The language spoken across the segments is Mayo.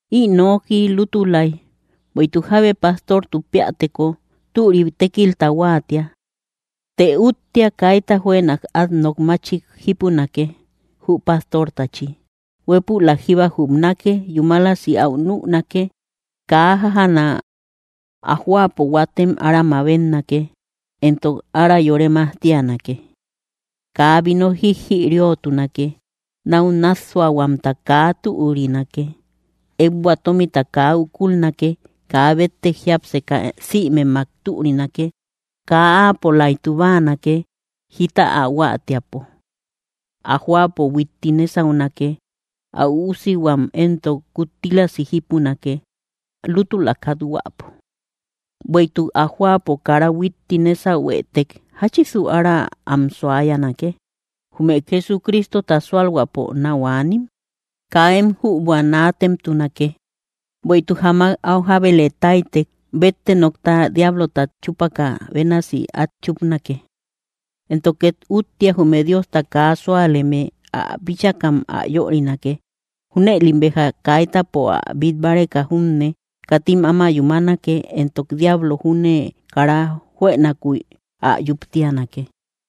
Ï noki lútulay: Bueïtuk jábe pastortu péäteko, türik tékilta huáatia. Të úttia, kaita juënak át nok máchik jípunake, jü pastortachi. Huépülak jíba jupnake, yúmalasi áu nünake, kaa jájaana. Ä jóapo huatem ára mabetnake, entok ára yore majtianake. Kaa vino jijïriotunake; náu nássuahuamta kaa türinake; ékbua tómita kaa ukulnake; kaa béttek jiápseka sïmemmak türinake; kaa áapolaytu báanake, jita ä huáatiäpo. Ä jóapo huitti nésaunake; ä üusihuam éntok kuttílasi jípunake, lútula kathuäpo. Büeituk ä jóapo kara huitti nésahuetek, ¿jáchisu ára am suayanake, jume Jesucristota súalhuäpo náu aanim? Kaa én jübua naatemtunake, bueïtuk jamak áu jábele táytek, bétte nokta diablotat chúpukä bénasi át chúpnake. Entok két úttia, jume Diosta kaa súaleme ä bíchakam ä yörinake. Júnëlim béja kaitäpo ä bít báreka junne, katim áma yúmanake, entok diablo júne kara juënakuy ä yuktianake.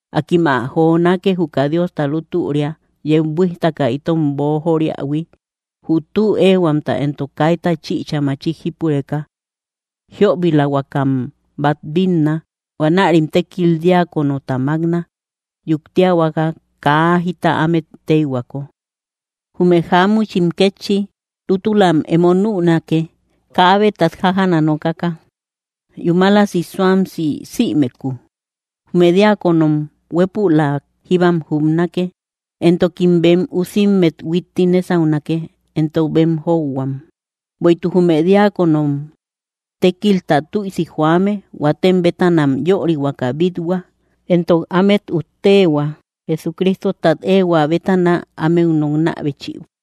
Akim ä jonake, juka Diosta lútüria yeu buíjtaka itom boojoriähui, jü tü éehuamta éntok kaita chïcha machik jípureka. Jiöbilahuakam bát bínna; huanärim tékil diáconota mákna, yuktiahuaka kaa jita ámet téyhuako. Jume jáamuchim kétchi, lútulam emo nünake, kaa jabetat jajaana nokaka, yúmalasi suamsi sïmekuu. Jume diáconom huépülak jíbam jupnake, entokim bem üusimmet huitti nésaunake, entok bem jóuhuam. Bueïtuk jume diáconom tékilta tüisi joame, huatem bétanam yörihuaka bít-hua, entok ámet utteehua Jesucristotat éehuä bétana, ámeu nokna béchibïbo.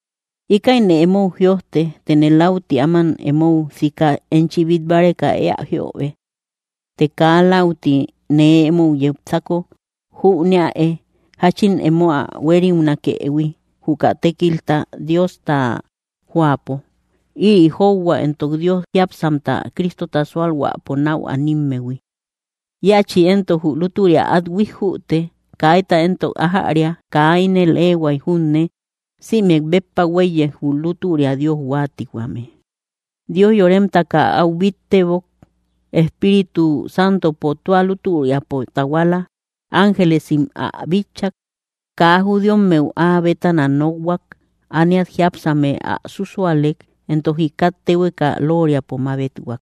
Íkäine emou jïojte, tëne läuti áman emou sika enchi bít báreka éä jíöbe. Të kaa läuti nee emou yepsako, jüneäe jáchin emo ä huériunakëhui, juka tékilta Diosta jóapo. Ïri jóuhua éntok Dios jiápsamta Cristota sualhuäpo nau animmehui. Íachi éntok jü lútüria át huíjjüte. Kaita éntok ájäria kaa ínel éehuay junne, sïmek béppa huéiye, jü lútüria Dios huáatihuame: Dios yóremtaka áu bíttebok, Espíritu Santopo tua lútüriapo tahuala, ángelesim ä bitchak. Kaa judíommeu áa bétana nokhuak, ániat jiápsame ä súsualek, entok jikat téhueka lóoriapo mabethuak.